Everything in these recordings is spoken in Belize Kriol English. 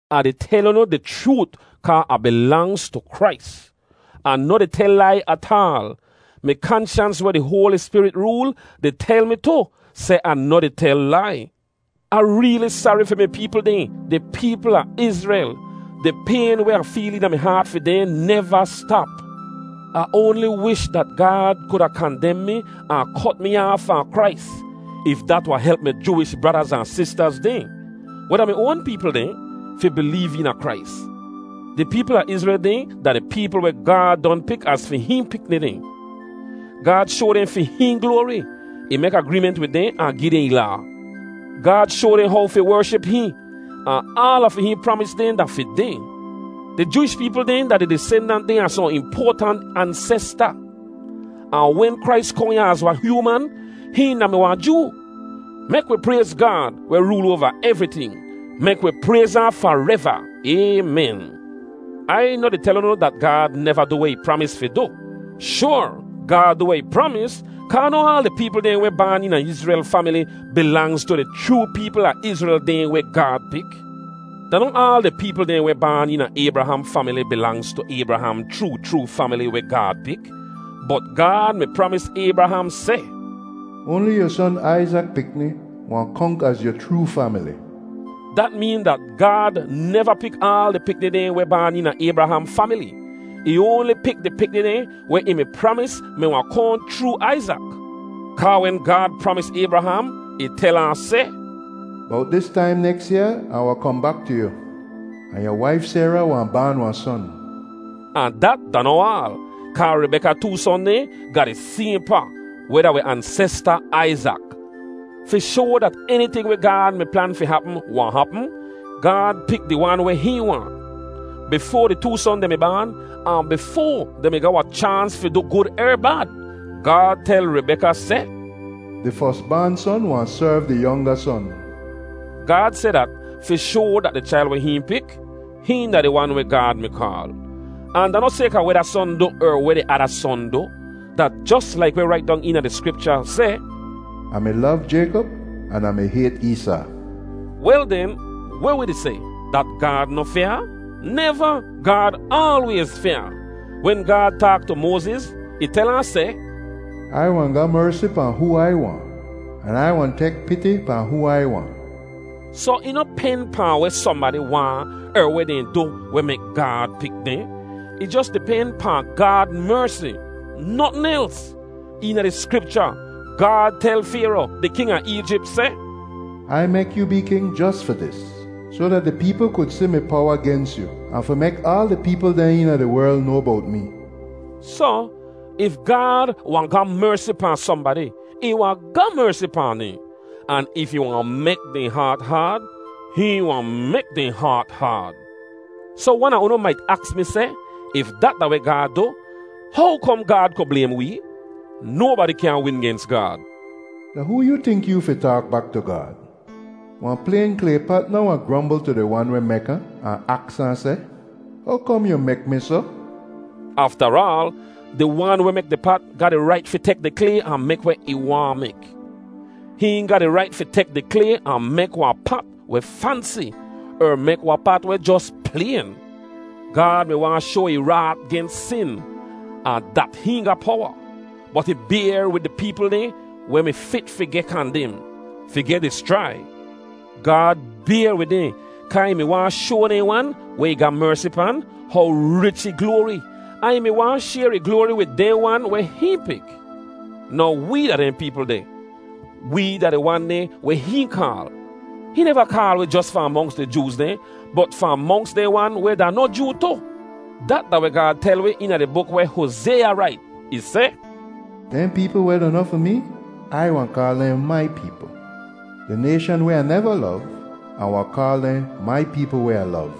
Ah di tel unu di chroot kaa Ah bilangz tu Krais. Ah noh di tel lai ataal. Mi kanshans weh di Hoali Spirit rool di tel mi tu seh Ah noh di tel lai. Ah reeli sari fi mi peepl dehn, di peepl a Izrel. Di payn weh Ah feel eena mi haat fi dehn neva stap. Ah oanli wish dat Gaad kuda kandem mi ahn kot mi aaf fahn Krais if dat wahn help mi Jooish bradaz ahn sistaz dehn, weh da mi oan peepl dehn, fi bileev eena Krais. Di peepl a Izrel dehn da di peepl weh Gaad don pik az fi hihn pikni dehn. Gaad shoa dehn fi hihn gloari. Ih mek agreement wid dehn ahn gi dehn ih Laa. Gaad shoa dehn how fi wership hihn, ahn aala fi hihn pramis dehn da fi dehn. Di Jooish peepl dehn da di disendant dehn a sohn impoatant ansesta. Ahn wen Krais kohn ya az wahn hyooman, hihn da mi wahn Joo. Mek wi prayz Gaad, weh rool oava evriting. Mek wi prayz ahn fareva! Aymen. Ai noh di tel unu dat Gaad neva du weh ih pramis fi du. Shoar, Gaad du weh ih pramis, kaa noh aal di peepl dehn weh baan eena Izrel famili bilangz tu di chroo peepl a Izrel dehn weh Gaad pik. Da noh aal di peepl dehn weh baan eena Aybraham famili bilangz tu Aybraham chroo chroo famili weh Gaad pik. Bot Gaad mi pramis Aybraham seh, “Oanli yu son Aizak pikni wahn konk az yu chroo famili.” Dat meen dat Gaad neva pik aal di pikni dehn weh baan eena Aybraham famili; ih oanli pik di pikni dehn weh ih mi pramis mi wahn kohn chroo Aizak. Kaa wen Gaad pramis Aybraham, ih tel ahn seh, “Bowt dis taim neks yaa Ah wahn kohn bak tu yu, ahn yu waif Sayra wahn baan wahn son.” Ahn dat da noh aal, kaa Ribeka too son dehn ga di sayhn pa, weh da wi ansesta Aizak. Fi shoa dat eniting weh Gaad mi plan fi hapm wahn hapm, Gaad pik di wan weh hihn waahn. Bifoa di too son dehn mi baan, ahn bifoa dehn mi ga wahn chaans fi du gud er bad, Gaad tel Ribeka seh, “Di fos baan son wahn serv di yonga son.” Gaad seh dat fi shoa dat di chail weh hihn pik, hihn da di wan weh Gaad mi kaal. Ahn da noh sayka weh da son du er weh di ada son du. Da jos laik weh rait dong eena di Skripcha seh, “Ah mi lov Jaykop an Ah mi hayt Eesaa.” Wel den, weh wi di seh, dat Gaad noh fyaa? Neva! Gaad aalwayz fyaa. Wen Gaad taak tu Moaziz, ih tel ahn seh, “Ai wahn ga mersi pahn hoo Ai waahn, an Ai wahn tek piti pahn hoo Ai waahn.” Soh ih noh pen pahn weh sohnbadi waahn er weh dehn du weh mek Gaad pik dehn. Ih jos di pen pahn Gaad mersi, notn els. Eena di Skripcha, Gaad tel Fayro, di king a Eejip, seh, “Ai mek yoo bee king jos fi dis, soh dat di peepl ku si mi powa gens yu, ahn fi mek aal di peepl dehn eena di werl noa bowt mee.” Soh, if Gaad wahn ga mersi pahn sohnbadi, ih wahn ga mersi pahn dehn. Ahn if ih wahn mek dehn haat haad, hihn wahn mek dehn haat haad. Soh wan a unu mait aks mi seh, “If dat da weh Gaad du, how kom Gaad ku blaym wee? Nobadi kyaahn win gens Gaad.” Da hoo yu tink yoo fi taak bak tu Gaad? Wahn playn klay pat noh wahn grombl tu di wan weh mek ahn, ahn aks ahn seh, “How kom yu mek mi soh?” Aftaraal, di wan weh mek di pat ga di rait fi tek di klay ahn mek weh ih waahn mek. Hihn ga di rait fi tek di klay ahn mek wahn pat weh fansi er mek wahn pat weh jos playn. Gaad mi waahn shoa ih raat gens sin, ahn dat hihn ga powa. Bot ih bayr wid di peepl dehn weh mi fit fi geh kandem, fi geh dischrai. Gaad bayr wid dehn kaa ih mi waahn shoa dehn wan weh ih ga mersi pan, how rich ih gloari, ahn ih mi waahn shayr ih gloari wid dehn wan weh hihn pik. Now wee da dehn peepl deh; wee da di wan dehn weh hihn kaal. Hihn neva kaal wi jos fahn monks di Jooz dehn bot fahn monks dehn wan weh da noh Joo tu. Dat da weh Gaad tel wi eena di buk weh Hozaya rait. Ih seh, “Dehn peepl weh da noh fi mee, Ai wahn kaal dehn ‘mai peepl.’ Di nayshan weh Ah neva lov, Ah wahn kaal dehn ‘Mai peepl weh Ah lov.’”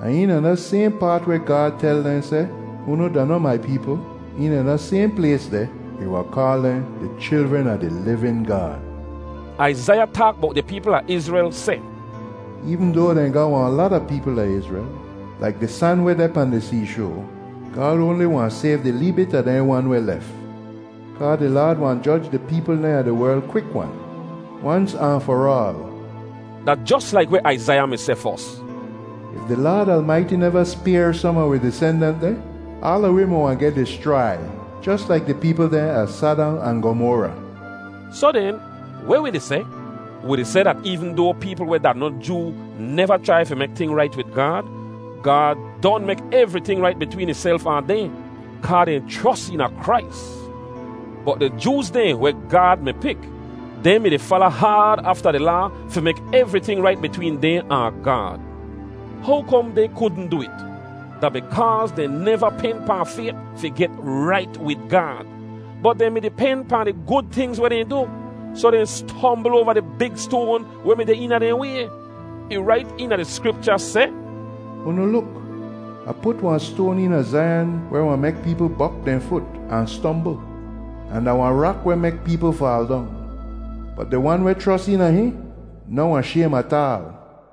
“Ahn eena da sayhn paat weh Gaad tel dehn seh, ‘Unu da noh mai peepl,’ eena da sayhn plays deh, ih wahn kaal dehn ‘di chilren a di livin Gaad.’” Aizaiya taak bowt di peepl a Izrel seh, “Eevn doa dehn ga wahn lata peepl da Izrel, laik di san weh deh pahn di seeshoa, Gaad oanli wahn sayv di lee bit a dehn wan weh lef. Kaa di Laad wahn joj di peepl dehn a di werl kwik-wan, wans ahn far aal.” Da jos laik weh Aizaiya mi seh fos, “If di Laad Almaiti neva spayr som a wi disendant dehn, aala wi mi wahn geh dischrai jos laik di peepl dehn a Sadam ahn Gomora.” Soh den, weh wi di seh? Wi di seh dat eevn doa peepl weh da noh Joo neva chrai fi mek ting rait wid Gaad, Gaad don mek evriting rait bitween ihself ahn dehn, kaa dehn chros eena Krais. Bot di Jooz dehn weh Gaad mi pik, dehn mi-di fala haad afta di Laa fi mek evriting rait bitween dehn ahn Gaad. How kom dehn kudn du it? Da bikaaz dehn neva pen pahn fayt fi get rait wid Gaad, bot dehn mi-di pen pahn di gud tingz weh dehn du. Soh dehn stombl oava di big stoan weh mi deh eena dehn way. Ih rait eena di Skripcha seh, “Unu luk! Ah put wahn stoan eena Zaiyan weh wahn mek peepl bok dehn fut, ahn stombl, ahn da wahn rak weh mek peepl faal dong. Bot di wan weh chros eena hihn noh wahn shaym ataal.”